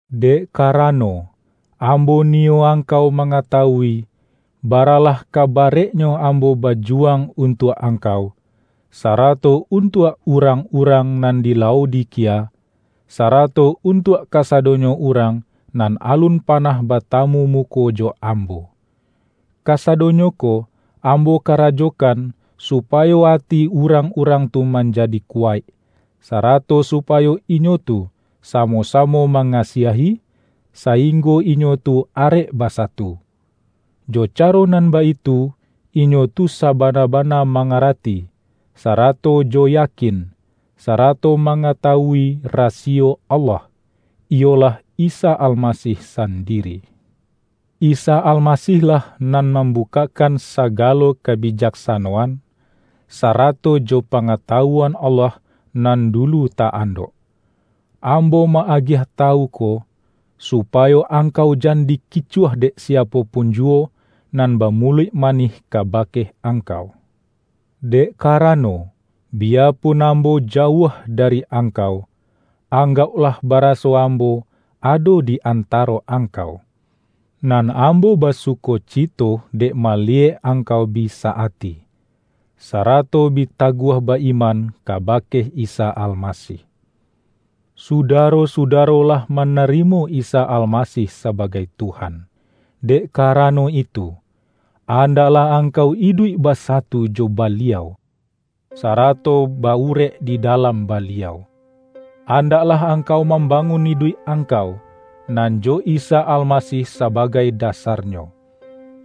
Dek karano, ambo niyo angkau mangatawui, baralah ka barek-nyo ambo bajuwang untuak angkau, sarato untuak urang-urang nan di Laodikia, sarato untuak kasadonyo urang nan alun panah batamu muko jo ambo. Kasadonyo ko ambo karajokan supayo ati urang-urang tu manjadi kuwaik, sarato supayo inyo tu samo-samo mangasiahi, saing-go inyo tu arek basatu. Jo caro nan baitu, inyo tu sabana-bana mangara-ti, sarato jo yakin, sarato mangata-wui rasiyo Allah, iyolah Isa Almasih sandiri. Isa Almasih-lah nan mam-bukakkan sagalo kabijaksanoan, sa-rato jo pangatawuan Allah nan du-lu ta-andok. Ambo ma-agiah tawu ko, supayo angkau jan dikicuah dek siapo pun juwo nan bamuluik manih kabake angkau. Dek karano, biyapun ambo jauah dari angkau, anggauklah bara-so ambo ado di antaro angkau. Nan ambo basukocito dek maliyek angkau bi sa-ati, sarato bi taguah ba-iman ka-bake Isa Almasih. Sudaro-sudaro lah manarimo Isa Almasih sabagai Tuhan. Dek karano itu, andaklah angkau iduik basatu jo Baliau, sarato ba-urek di dalam Ba-liau. Andaklah angkau mambangun iduik angkau, nan jo Isa Almasih sa-bagai dasarnyo.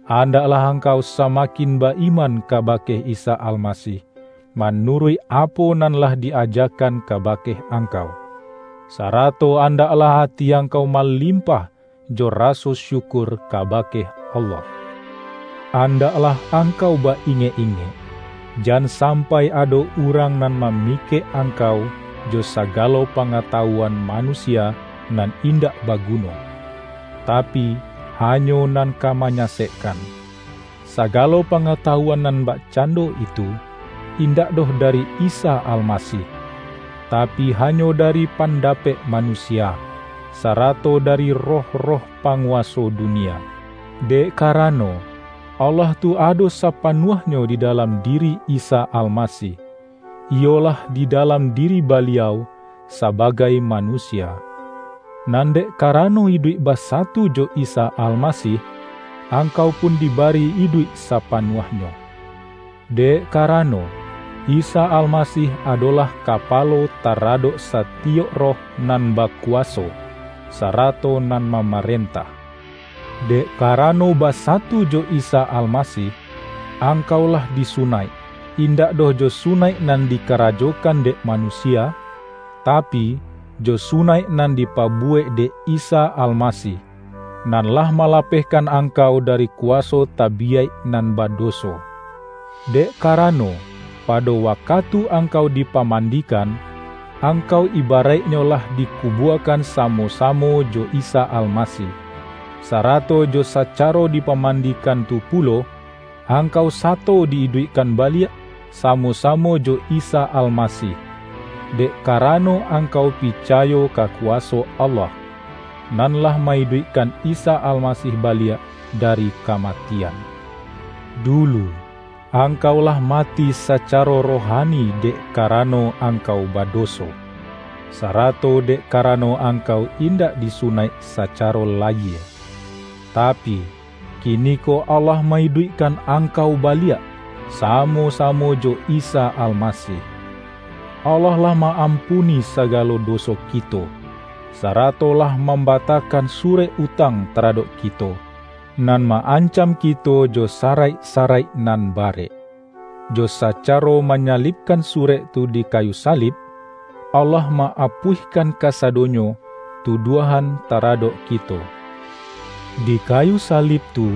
Andaklah angkau sa-makin ba-iman kabake Isa Almasih, manuruik apo nan lah di-ajakan ka-bake angkau. Sarato andaklah ati angkau malimpah jo raso syukur ka-bake Allah. Andaklah angkau ba-ingek-ingek, jan sampai ado urang nan mamikek angkau jo sagalo pangatawuan manu-sia nan indak baguno, tapi hanyo nan ka manyasekkan. Sagalo pangatawu-an nan bakcando itu, indak doh dari Isa Almasih, tapi hanyo dari panda-pek manusia, sarato dari roh-roh pa-nguwaso dunia. Dek karano, Allah tu ado sapanuahnyo di dalam diri Isa Almasih, iyolah di dalam diri Baliau sabagai manusia. Nan dek karano iduik basatu jo Isa Almasih, angkau pun dibari iduik sapanuahnyo. Dek karano, Isa Almasih adolah Kapalo taradok satiyok roh nan bakuwaso, sarato nan mamarentah. Dek karano basatu jo Isa Almasih, angkau lah disunaik, indak doh jo sunaik nan dikarajokan dek manu-sia, tapi, jo sunaik nan dipabuwek dek Isa Almasih, nan lah malapeh-kan angkau dari kuwaso tabiyaik nan badoso. Dek karano, pado wa-katu angkau dipamandikan, angkau ibaraiknyo lah dikubuakan samo-sa-mo jo Isa Almasih; sarato jo sacaro dipamandikan tu pulo, angkau sato di-iduikkan baliak samo-samo jo Isa Almasih, dek karano angkau picayo ka kuwaso Allah, nan lah ma-iduik-kan Isa Almasih baliak dari kamati-an. Dulu, angkau lah mati sacaro rohani dek karano angkau badoso, sarato dek karano angkau indak disu-naik sacaro layie. Tapi, kiniko Allah ma-iduikkan angkau baliak, samo-sa-mo jo Isa Almasih. Allah lah ma-am-puni sagalo doso kito, sarato lah mambatakan surek utang taradok ki-to, nan ma-ancam kito jo saraik-sa-raik nan barek. Jo sacaro manya-libkan surek tu di kayu salib, Allah ma-apuihkan kasadonyo tuduahan taradok kito. Di kayu salib tu,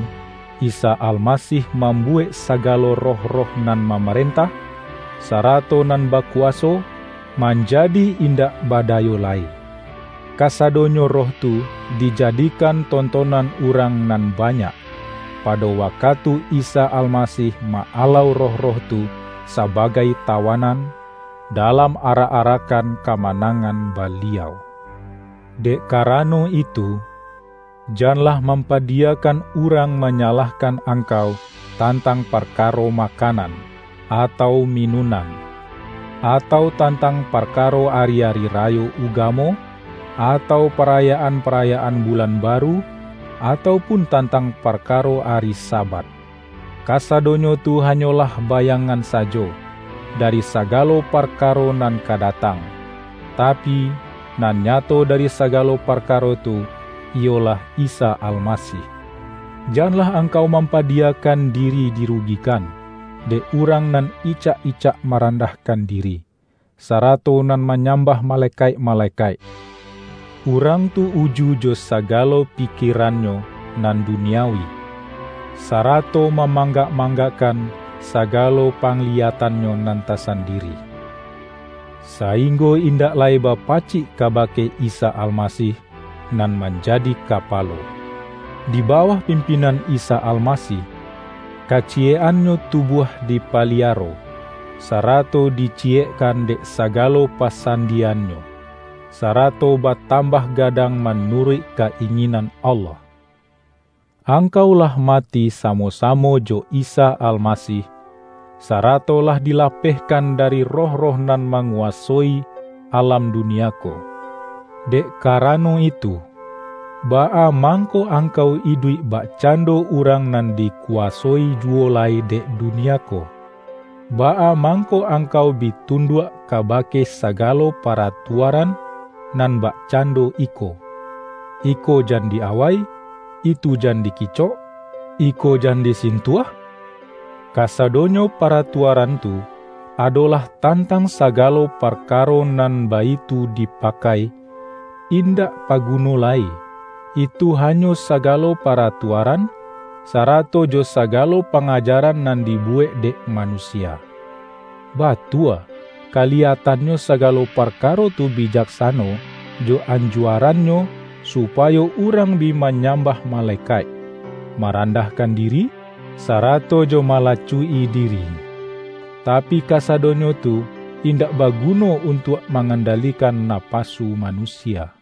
Isa Almasih mambuwek sagalo roh-roh nan mamarentah, sarato nan baku-waso, manjadi indak badayo lai. Ka-sadonyo roh tu dijadikan tontonan urang nan banyak, pado wakatu Isa Almasih ma-alau roh-roh tu sabagai tawanan, dalam arak-arakkan kama-nangan Baliau. Dek karano itu, janlah mampa-diyakan urang manyalahkan angkau tantang parkaro makanan, atau mi-nunan, atau tantang parkaro ari-ari rayo ugamo, atau parayaan-parayaan bulan baru, atau pun tantang parka-ro ari Sabat. Kasadonyo tu hanyolah bayangan sajo, dari sagalo parka-ro nan ka datang, tapi, nan nyato dari sagalo parkaro tu, iyolah Isa Almasih! Janlah angkau mampadiyakan di-ri dirugikan, dek urang nan icak-icak marandahkan diri, sarato nan ma-nyambah malekaik-malekaik. Urang tu uju jo sagalo pikierannyo nan du-niawi, sarato mamanggak-manggak-kan sagalo pangliyatannyo nan ta-sandiri, sainggo indak lai bapacik kabake Isa Almasih nan manjadi Ka-palo. Di bawah pimpinan Isa Almasih, kaciyek-annyo tubuah dipaliaro, sa-rato diciyekkan dek sagalo pasandi-yannyo, sarato batambah gadang ma-nuruik ka-inginan Allah. Angkau lah mati samo-samo jo Isa Almasih, sarato lah dilapehkan dari roh-roh nan manguwasoi alam dunia ko. Dek karano itu, baa mang-ko angkau iduik bakcando urang nan dikuwasoi juwo lai dek dunia ko? Baa mangko angkau bi tunduak kaba-ke sagalo paratuaran nan bakcando iko, ”Iko jan di-awai",”Itu jan di-kicok",”Iko jan disintuah"? Kasa-donyo paratuaran tu, adolah tantang sagalo parkaro nan baitu dipakai, in-dak paguno lai. Itu hanyo sagalo pa-ratuaran, sarato jo sagalo pangajaran nan dibuwek dek manusia. Batua, kaliyatannyo sagalo parkaro tu bijak-sano jo anjuarannyo supayo urang bi manyambah malekaik, marandahkan diri, sarato jo malacuik-i diri; tapi, kasadonyo tu indak baguno untuak mangandalikan napasu manusia.